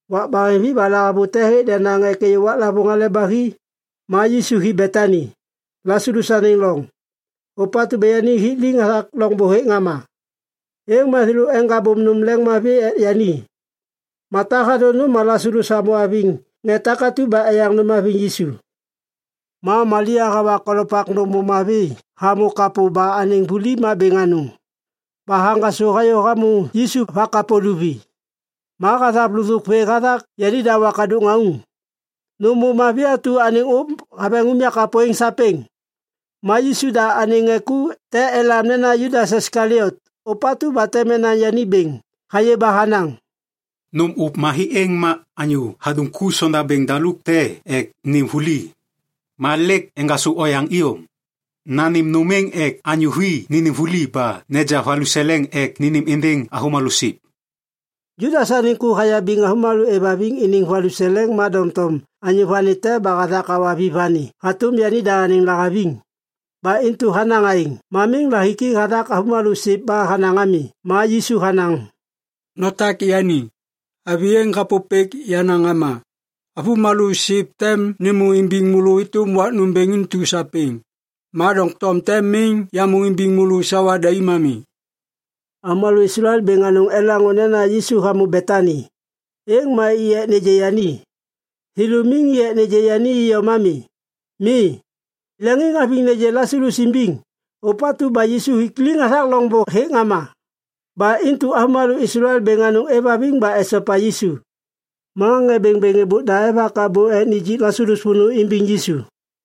Wak baheŋvi ba lahavute hêk denaŋ ek êyô waklavôŋ Hale ba Hi. Ma Yisu hi Betani, Lasalus anêŋ loŋ, ôpatu ba yani hik liŋ hathak loŋbô hêk ŋama. Êŋ ma thêlô eŋgabôm nôm leŋiŋmavi ek yani. Mata hathô nôm ma Lasalus hamô haviŋ ŋê takatu ba eyaŋ nôm haviŋ Yisu. Ma Malia hawa kolopak nôm ôv mavi hamô kapô ba anêŋ vuli ma bêŋ anôŋ ba haŋgasô hayô hamô Yisu va kapô luvi. Ma hathav lôthôk vê hathak yanida wakadôk ŋauŋ. Ma nôm ôv mavi atu anêŋ ôv haveŋ unyak kapô êŋ sapêŋ. Ma Yisu da anêŋ ŋê ku te elam nena Judas Iskaliot ôpatu ba tem enaŋ yani bêŋ hayê ba hanaŋ, “Nôm ôv mavi êŋ ma anyô hadum ku sondabêŋ daluk te ek nêm vuli! Ma lêk eŋgasô oyaŋ iyom! Nanêm nôm êŋ ek anyô vi nênêm vuli ba naja valuseleŋ ek nanêm êndêŋ avômalô siv.” Judas anêŋ ku hayabiŋ avômalô êvhaviŋ iniŋ valuseleŋ ma doŋtom anyô vani te ba hathak hawa vi vani hatôm yanida anêŋ lahaviŋ. Ba intu hanaŋ aêŋ. Ma miŋ lahiki hathak avômalô siv ba hanaŋ ami. Ma Yisu hanaŋ, “Notak yani. Avi êŋ hapôpêk yenaŋ ŋama. Avômalô siv tem nêmô imbiŋ môlô êtôm wak nômbêŋ intu sapêŋ. Ma doŋtom tem miŋ yamô imbiŋ môlô sawa daim ami.” Avômalô Islael bêŋ anôŋ elaŋô nena Yisu hamô Betani. Êŋ ma i ek nêgê yani. Thêlô miŋ i ek nêgê yani iyom ami. Mi. Leŋiŋhaviŋ nêgê Lasalus imbiŋ, ôpatu ba Yisu hik liŋ hathak loŋbô hêk ŋama. Ba intu avômalô Islael bêŋ anôŋ êvhaviŋ ba esopa Yisu. Ma ŋê bêŋbêŋ êbôk da evak abô ek nijik Lasalus vônô imbiŋ Yisu.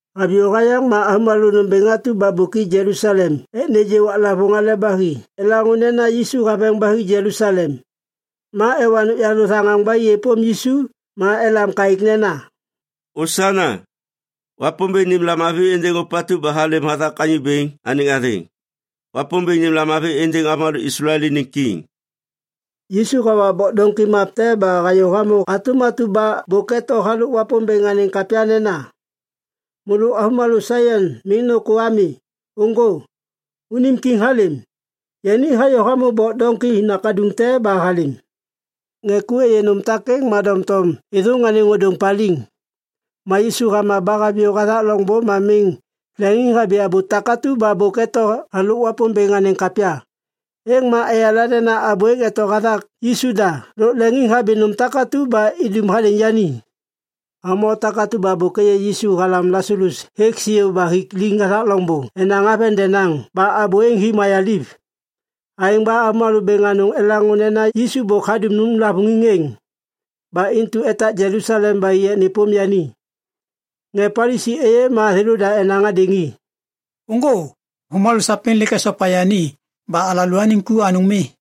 Haviyô hayaŋ ma avômalô nômbêŋ atu ba bôk i Jelusalem ek nêgê waklavôŋ Hale ba Hi elaŋô nena Yisu haveŋ ba hi Jelusalem. Ma ewa nôkyalô thaŋaŋ ba i êpôm Yisu ma elam kaêk nena, “Osana!” “Wapômbêŋ nêm lamavi êndêŋ ôpatu ba halêm hathak Anyô Bêŋ anêŋ athêŋ!” “Wapômbêŋ nêm lamavi êndêŋ avômalô Islael iniŋ Kiŋ!” Yisu hawa bok doŋki map te ba hayô hamô hatôm atu ba bôk eto halôk Wapômbêŋ anêŋ kapya nena, “Môlô avômalô Saion miŋ nôkô ami. Ôŋgô! Unim kiŋ halêm! Yani hayô hamô bok doŋki nakaduŋ te ba halêm!” Ŋê ku êyê nôm takêŋ ma doŋtom êthôŋ anêŋ ôdôŋ paliŋ. Ma Yisu hama ba haviyô hathak loŋbô ma miŋ leŋiŋhabi abô takatu ba bôk eto halôk Wapômbêŋ anêŋ kapya. Êŋ ma eyala nena abô êŋ eto hathak Yisu da lôk leŋiŋhabi nôm takatu ba idum hadêŋ yani. Avômalô takatu ba bôk êyê Yisu halam Lasalus hêk siô ba hik liŋ hathak loŋbô enaŋ haveŋ denaŋ ba abô êŋ hi mayaliv. Aêŋ ba avômalô bêŋ anôŋ elaŋô nena Yisu bôk hadum lavôŋiŋ êŋ. Ba intu etak Jelusalem ba i ek nêpôm yani. Ŋê Palisi êyê ma thêlôda enaŋ hadêŋ i, “Ôŋgô! Avômalô sapêŋ lêk esopa yani ba alalôaniŋ ku anôŋ mi.”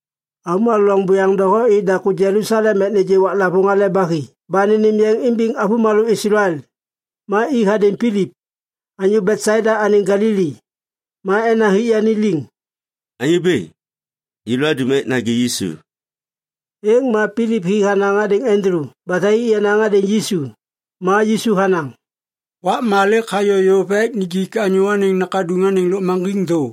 Avômalô loŋ buyaŋ doho i daku Jelusalem ek nêgê waklavôŋ Hale ba Hi ba nênêm yeŋ imbiŋ avômalô Islael. Ma i hadêŋ Pilip, anyô Betsaida anêŋ Galili. Ma enaŋ hik yani liŋ, “Anyô bêŋ, yêlô adum ek nagê Yisu.” Êŋ ma Pilip hi hanaŋ hadêŋ Andulu ba thai i enaŋ hadêŋ Yisu. Ma Yisu hanaŋ, “Wakma lêk hayô yôv ek injik Anyô Anêŋ Nakaduŋ anêŋ lôkmaŋgiŋ thô.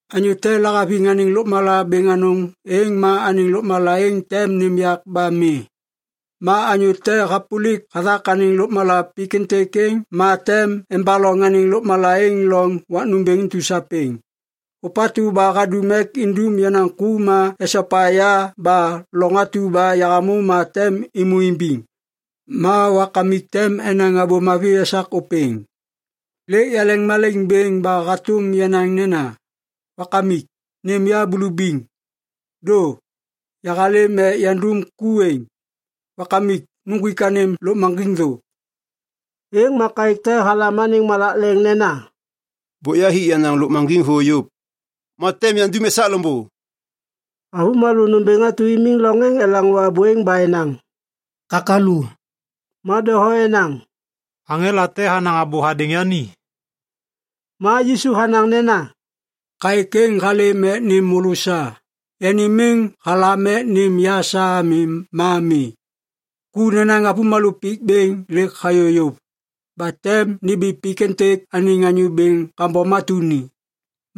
Anyô te lahaviŋ anêŋ lôkmala bêŋ anôŋ êŋ ma anêŋ lôkmala êŋ tem nêm yak ba mi. Ma anyô te hapôlik hathak anêŋ lôkmala pik êntêk êŋ ma tem embaloŋ anêŋ lôkmala êŋ loŋ wak nômbêŋ intu sapêŋ. Ôpatu ba hadum ek indum yenaŋ ku ma esopa ya ba loŋ atu ba yahamô ma tem êmô imbiŋ. Ma Wakamik tem enaŋ abô mavi esak ôpêŋ. “Lêk yaleŋmalaiŋ bêŋ ba hatôm yanaŋ nena, ‘Wakamik, nêm ya bulubiŋ.’ Dô! Yahalêm ek yandum ku êŋ. Wakamik, nuŋgwik anêm lôkmaŋgiŋ thô!” Êŋ ma kaêk te halam anêŋ malak leŋ nena, “Bôk yahik yenaŋ lôkmaŋgiŋ thô yôv. Ma tem yandum esak loŋbô.” Avômalô nômbêŋ atu imiŋ loŋ êŋ elaŋô abô êŋ ba enaŋ, “Kakalu!” Ma doho enaŋ, “Aŋela te hanaŋ abô hadêŋ yani!” Ma Yisu hanaŋ nena, “Kaêk êŋ halêm ek nêm môlô sa. Yani miŋ halam ek nêm ya sa ami ma mi. Ku nenaŋ avômalô pik bêŋ lêk hayô yôv. Ba tem nimbi pik êntêk anêŋ anyô bêŋ kambom atu ni.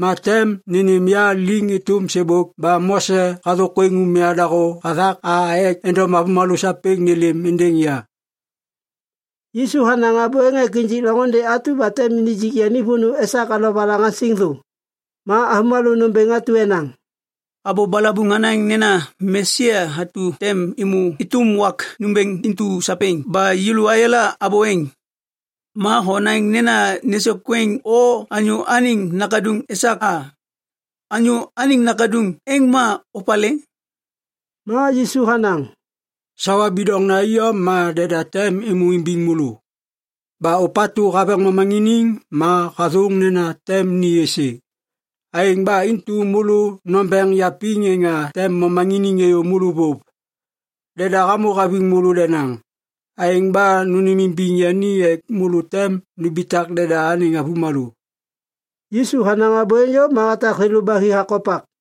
Ma tem nênêm ya liŋ êtôm sêbôk ba Mose hathôkwêŋ umya dahô hathak a ek endom avômalô sapêŋ nêlêm êndêŋ ya.” Yisu hanaŋ abô êŋ ek injik loŋôndê atu ba tem nijik yani vônô esak alovalaŋaŋsiŋ thô. Ma avômalô nômbêŋ atu enaŋ, “Abô balabuŋ hanaŋ nena Mesia atu tem êmô êtôm wak nômbêŋ intu sapêŋ ba yêlô ayala abô êŋ. Ma honaŋ nena nêsôkwêŋ o Anyô Anêŋ Nakaduŋ esak a. Anyô Anêŋ Nakaduŋ êŋ ma opalê?” Ma Yisu hanaŋ, “Sawa bidoŋ iyom ma deda tem êmô imbiŋ môlô. Ba ôpatu haveŋ momaŋiniŋ ma hathôŋ nena tem ni êsê. Aêŋ ba intu môlô nombeŋ yapiŋ êŋa tem momaŋiniŋ êyô môlô vôv! Deda hamô haviŋ môlô denaŋ. Aêŋ ba nônêmimbiŋ yani ek môlô tem numbitak deda anêŋ avômalô.” Yisu hanaŋ abô êŋ yôv ma hatak thêlô ba hi hakopak.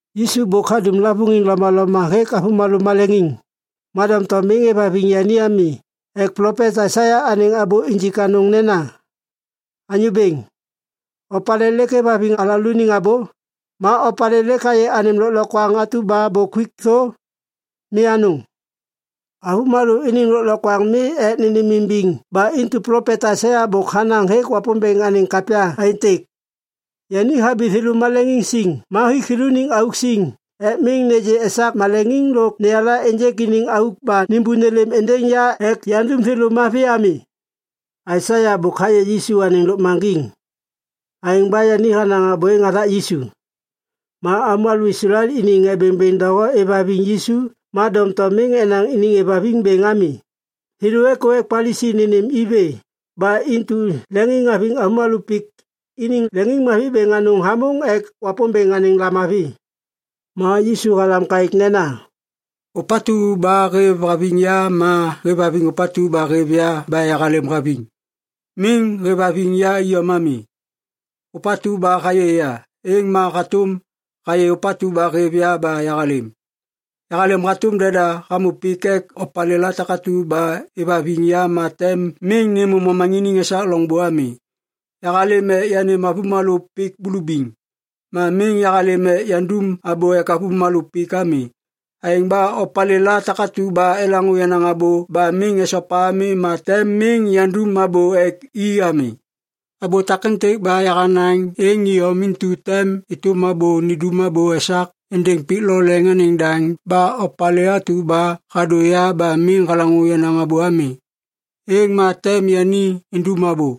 Yisu bôk hadum lavôŋiŋ lomaloma hêk avômalô maleŋiŋ. Ma doŋtom miŋ êvhaviŋ yani ami ek plopet Aisaia anêŋ abô injik anôŋ nena, “Anyô Bêŋ, opalê lêk hêvhaviŋ alalôaniŋ abô? Ma opalê lêk hayê anêm lôklokwaŋ atu ba bôk huik thô? Mi anôŋ.” Avômalô iniŋ lôklokwaŋ mi ek nêmimbiŋ ba intu plopet Aisaia bôk hanaŋ hêk Wapômbêŋ anêŋ kapya aêntêk, “Yani habi thêlô maleŋiŋ siŋ ma hik thêlôniŋ auk siŋ ek miŋ nêgê esak maleŋiŋ lôk neyala ênjêk iniŋ auk ba nêmbô nêlêm êndêŋ ya ek yandum thêlô mavi ami.” Aisaia bôk hayê Yisu anêŋ lôkmaŋgiŋ. Aêŋ ba yani hanaŋ abô êŋ hathak Yisu. Ma avômalô Islael iniŋ ŋê bêŋbêŋ doho êvhaviŋ Yisu ma doŋtom miŋ enaŋ iniŋ êvhaviŋ bêŋ ami. Thêlô êkô ek Palisi nênêm i vê ba intu leŋiŋhaviŋ avômalô pik iniŋ leŋiŋmavi bêŋ anôŋ hamôŋ ek Wapômbêŋ anêŋ lamavi. Ma Yisu halam kaêk nena, “Ôpatu ba hêvhaviŋ ya ma hêvhaviŋ ôpatu ba hêv ya ba yahalêm haviŋ. Miŋ hêvhaviŋ ya iyom ami. Ôpatu ba hayê ya, êŋ ma hatôm hayê ôpatu ba hêv ya ba yahalêm. Yahalêm hatôm deda hamô pik ek opalêla takatu ba êvhaviŋ ya ma tem miŋ nêmô momaŋiniŋ esak loŋbô ami. “Yahalêm ek yanêm avômalô pik bulubiŋ. Ma miŋ yahalêm ek yandum abô ek avômalô pik ami. Aêŋ ba opalêla takatu ba elaŋô yenaŋ abô ba miŋ esopa ami ma tem miŋ yandum abô ek i ami. Abô takêntêk ba yahanaŋ êŋ iyom intu tem êtôm abô nindum abô esak êndêŋ pik lo leŋ anêŋ daŋ ba opalê atu ba hadô ya ba miŋ halaŋô yenaŋ abô ami, êŋ ma tem yani indum abô.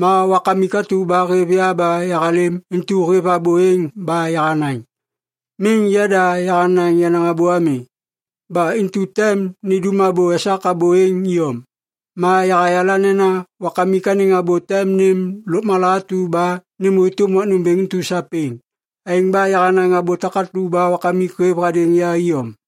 Ma Wakamik atu ba hêv ya ba yahalêm intu hêv abô êŋ ba yahanaŋ. Miŋ yada yahanaŋ yenaŋ abô ami. Ba intu tem nindum abô esak abô êŋ iyom. Ma yahayala nena Wakamik anêŋ abô tem nêm lôkmala atu ba nêmô êtôm wak nômbêŋ intu sapêŋ. Aêŋ ba yahanaŋ abô takatu ba Wakamik hêv hadêŋ ya iyom.”